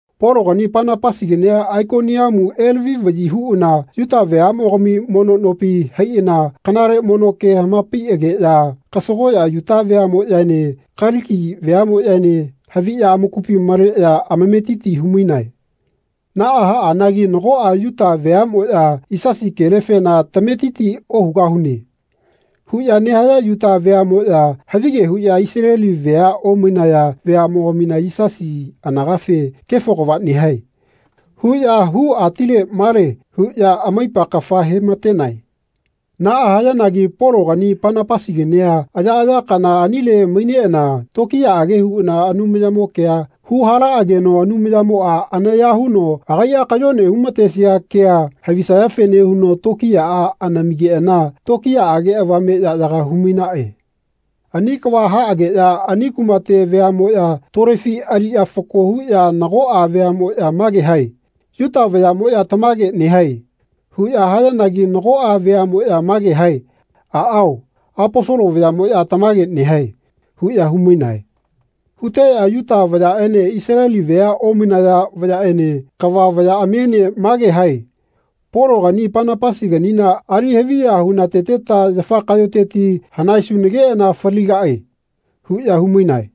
Pologani Panapasigania Aikoniamu elavi-vaꞌyi huꞌana Yuta veaꞌmogami mono nopi haiꞌana kanale mono ke hamapaiꞌageꞌya kasagoꞌya Yuta veaꞌmoꞌyaene Kaliki veaꞌmoꞌyaene haviꞌya amakupi maleꞌya amametiti humainae. Naꞌa haꞌanagi nagoꞌa Yuta veaꞌmoꞌya “Yisasi kelefena tametiti ohugahune.” huꞌya nehaya Yuta veaꞌmoꞌya havige huꞌya Isaleli vea omainaya veaꞌmogamina Yisasi anagafe “Kefo kava nehae.” huꞌya hu-atile-male huꞌya amaipa kafa hematenae. Naꞌa hayanagi Pologani Panapasigania ayaꞌaya kana anile maineꞌana tokiyaꞌage huꞌana Anumayamo kea huhalaꞌageno Anumayamoꞌa anaya huno agaiꞌa kayone humatesia kea havisayafene huno tokiyaꞌa anamigeꞌana tokiyaꞌage avame yaꞌyaga humainaꞌe. Ani kava haꞌageꞌya ani kumate veaꞌmoꞌya tolefi aliꞌya fako huꞌya nagoꞌa veaꞌmoꞌya mage hae “Yuta vayaꞌmoꞌya tamage nehae.” huꞌya hayanagi nagoꞌa veaꞌmoꞌya mage hae “Aꞌao, Aposolo vayaꞌmoꞌya tamagea nehae.” huꞌya humainae. Huteꞌya Yuta vayaꞌene Isaleli vea omainaya vayaꞌene kava vayaꞌamiene mage hae “Pologani Panapasiganina ali haviya hunateteta yafa kaꞌyoteti hanaesunageꞌana faligaꞌe.” huꞌya humainae.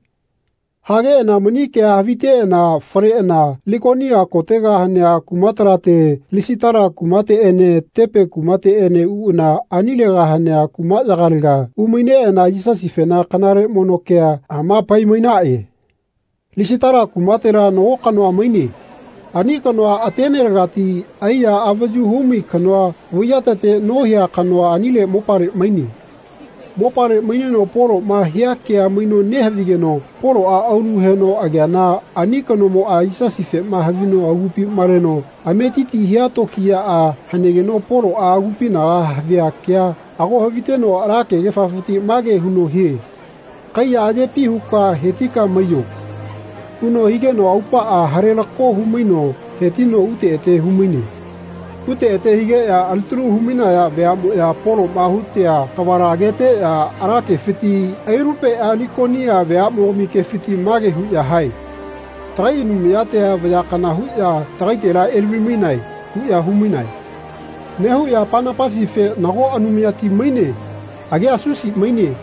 Hageꞌana mani kea haviteꞌana faleꞌana Likonia kotega hanea kumatalate Lisitala kumateꞌene Tepe kumateꞌene uꞌana anilega hanea kumaꞌyagalega umaineꞌana Yisasifena kanale mono kea hamapai-mainaꞌe. Lisitala kumatela nago kanoa maine. Ani kanoa atenelegati aiya avayu humai kanoa vaiyatete nohia kanoa anile mopale maine. Mopale maineno Poloꞌma hia kea maino nehavigeno Poloꞌa aulu heno ageana ani kanomoꞌa Yisasifema havino agupi maleno ametiti hia tokiyaꞌa hanegeno Poloꞌa agupinaga havia kea ago haviteno ala kegefafiti mage huno hie “Kaiya ayepi huka hetika maiyo.” huno higeno aupaꞌa halelako humaino hetino ute ete humaine. Ute ete higeꞌya alitalu humainaya veaꞌmoꞌya Poloꞌma hutea kavala ageteꞌya ala kefiti ailalupeꞌya Likonia veaꞌmogami kefiti mage huꞌya hae “Tagai anumayatia vaya kana huꞌya tagaitela elavi-mainae.” huꞌya humainae. Nehuꞌya Panapasife “Nago anumayati maine. Agia Susi maine.”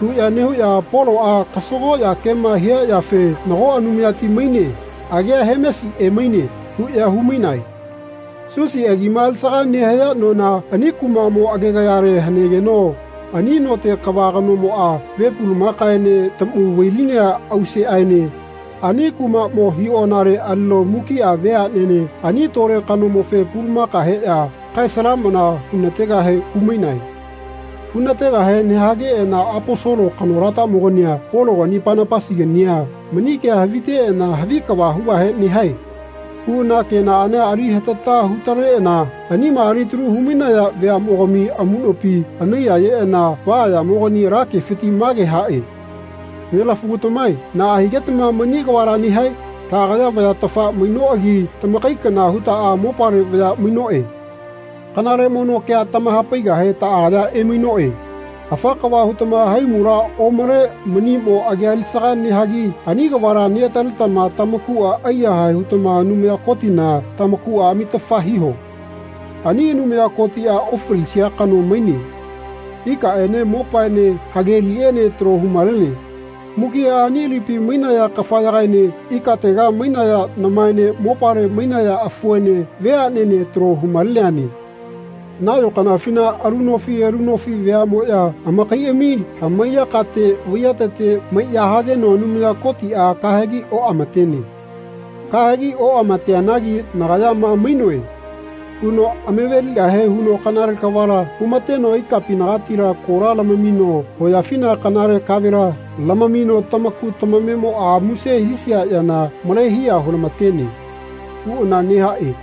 huꞌya nehuꞌya Poloꞌa kasagoꞌya kema hia yafe “Nago anumayati maine. Agia Hemesi emaine.” huꞌya humainae. Susi agima alisaga nehaya nona ani kumaꞌmo agegayalega hanegeno ani note kava kanomoꞌa ve pulumakaene taꞌmu vailinea auseꞌaene ani kumaꞌmo hiꞌonale alino mukiꞌa veaꞌnene ani tole kanomofe pulamaka heꞌya kae-salamana hunategahe humainae. Hunategahe nehageꞌana Aposolo kanolatamogania Pologani Panapasigania mani kea haviteꞌana “Havi kava hugahe nehae.” huꞌana kenaꞌania ali hatata hutaleꞌana anima alitalu humainaya veaꞌmogami amuꞌnopi anaiyayeꞌana vaꞌaꞌyamogani ala kefiti mage haꞌe “Nelaꞌafugatamae naꞌa higetama mani kavala nehae? Taꞌagaya vayatafa mainoꞌagi tamakai kana hutaꞌa mopale vaya mainoꞌe. Kanale mono kea tamahapaigahe taꞌagaya emainoꞌe. Afa kava hutama haimula omale maniꞌmo agi alisaga nehagi ani kavala neꞌataletama tamakuꞌa aiyahae hutama Anumaya Kotina tamakuꞌa amitafa hiho. Ani Anumaya Kotiꞌa ofalisia kano maine. Ikaꞌene mopaene hageliꞌene talo humalene. Mukiꞌa ani lipi mainaya kafayagaene ikatega mainaya namaene mopale mainaya afuene veaꞌnene talo humaleneane. Nayo kanafina alu nofi alu nofi veaꞌnemoꞌya amakaiꞌami hamaiya kate vaiyatete maiꞌya hageno Anumaya Kotiꞌa kahegi oꞌamatene Kahegi oꞌamateneanagi ‘Nagaya ma mainoe.’ huno amaveligahe huno kanale kavala humateno ikapinagatila kola lamamino hoyafina kanale kavela lamamino tamaku tamamemoꞌa muse hisia yana male hiya hulamatene.” huꞌana nehaꞌe.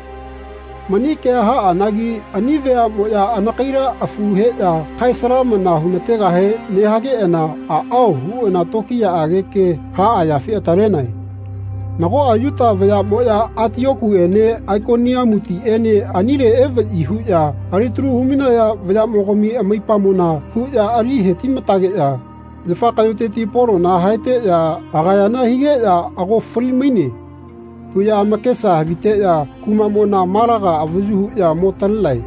Mani kea haꞌanagi ani veaꞌmoꞌya anakaila afu heꞌya kae-salamana henategahe nehageꞌana “Aꞌao.” huꞌana tokiyaꞌage ke haꞌa yafe atalenae. Nagoꞌa Yuta vayaꞌmoꞌya Atiokutiꞌene Aikoniamutiꞌene anile evaꞌyi huꞌya alitalu humainaya vayaꞌmogami amaipamona huꞌya ali hetimatageꞌya yafa kaꞌyoteti Polona haeteꞌya agayana higeꞌya “Ago fali-maine.” huꞌya amakesa haviteꞌya kumaꞌmona malaga avayu huꞌya mo talenae.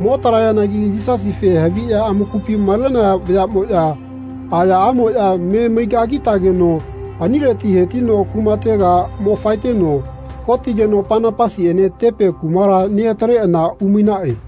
Mo talayanagi Yisasife haviya amakupi malenaya vayaꞌmoꞌya ayaꞌamoꞌya me maigagitageno anileti hetino kumatega mo faeteno kotigeno Panapasiꞌene Tepe kumala neꞌataleꞌana umainaꞌe.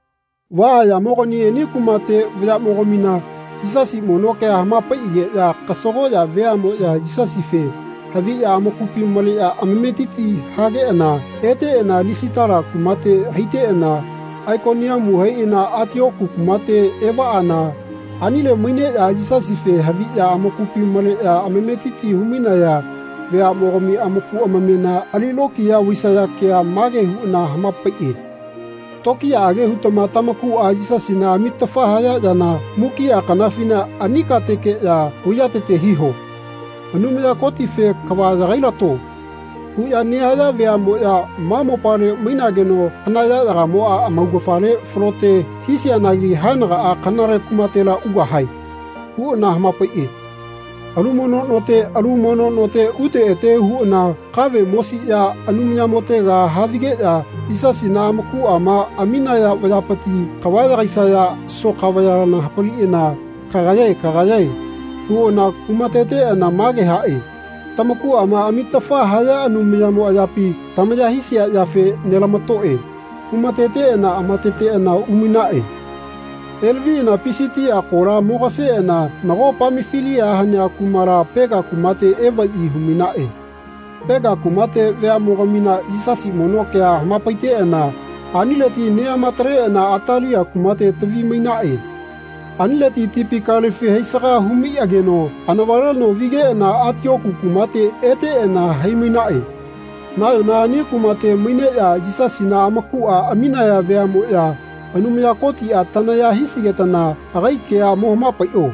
Vaꞌaꞌyamogani ani kumate vayaꞌmogamina Yisasi mono kea hamapaiꞌageꞌya kasagoꞌya veaꞌmoꞌya Yisasife haviꞌya amakupi maleꞌya amametiti hageꞌana eteꞌana Lisitala kumate haiteꞌana Aikoniamu haiꞌana Atioku kumate evaꞌana anile maineꞌya Yisasife haviꞌya amakupi maleꞌya amametiti humainaya veaꞌmogami amaku amamema ali lokiya vaisaya kea mage huꞌana hamapaiꞌe “Tokiyaꞌage hutama tamakuꞌa Yisasina amitafa haya yana mukiꞌa kanafina ani katekeꞌya vaiyatete hiho. Anumaya Kotife ‘Kava yagailato.’ huꞌya nehaya veaꞌmoꞌya ma mopale mainageno kana yaꞌyagamoꞌa amaugafale falote hisianagi haenagaꞌa kanale kumatela ugahae.” huꞌana hamapaiꞌe. Alu mono note alu mono note ute ete huꞌana kave mosiꞌya Anumayamotega havigeꞌya Yisasina amakuꞌama aminaya vayapiti kava yagaisaya soka vayala hapaliꞌana “Kagayae kagayae.” huꞌana humateteꞌana mage haꞌe “Tamakuꞌama amitafa haya Anumayamo ayapi tamaya hisia yafe nelamatoꞌe.” humateteꞌana amateteꞌana umainaꞌe. Elaviꞌana Pisitia kola mogaseꞌana nago Pamafilia hanea kumala Pega kumate evaꞌyi humainaꞌe. Pega kumate veaꞌmogamina Yisasi mono kea hamapaiteꞌana anileti neꞌamataleꞌana Atalia kumate tavi-mainaꞌe. Anileti tipi kalefi haisaga humaiꞌageno anavaleno vigeꞌana Atioku kumate eteꞌana hai-mainaꞌe. Nayona ani kumate maineꞌya Yisasina amakuꞌa aminaya veaꞌmoꞌya “Anumaya Kotiꞌa tanaya hisigetana agai kea mohamapaiꞌo.”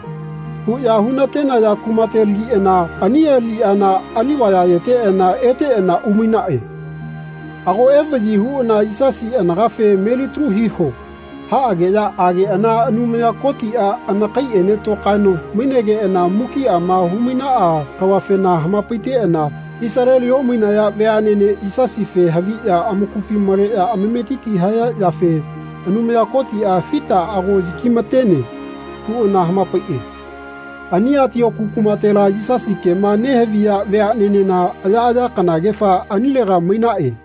huꞌya hunatenaya kumatelagiꞌana ani aliꞌyana ali-vayayeteꞌana eteꞌana umainaꞌe. Ago evaꞌyi huꞌana Yisasi anagafe “Melitalu hiho.” haꞌageꞌya ageꞌana Anumaya Kotiꞌa anakaiꞌene tokaeno mainegeꞌana mukiꞌama humainaꞌa kavafena hamapaiteꞌana Isaleli omainaya veaꞌnene Yisasife haviꞌya amakupi maleꞌya amametiti haya yafe Anumaya Kotiꞌa fita ago yakimatene huꞌana hamapaiꞌe. Ani Atioku kumatela Yisasi kema nehaviya veaꞌnenena ayaꞌaya kanagefa anilega mainaꞌe.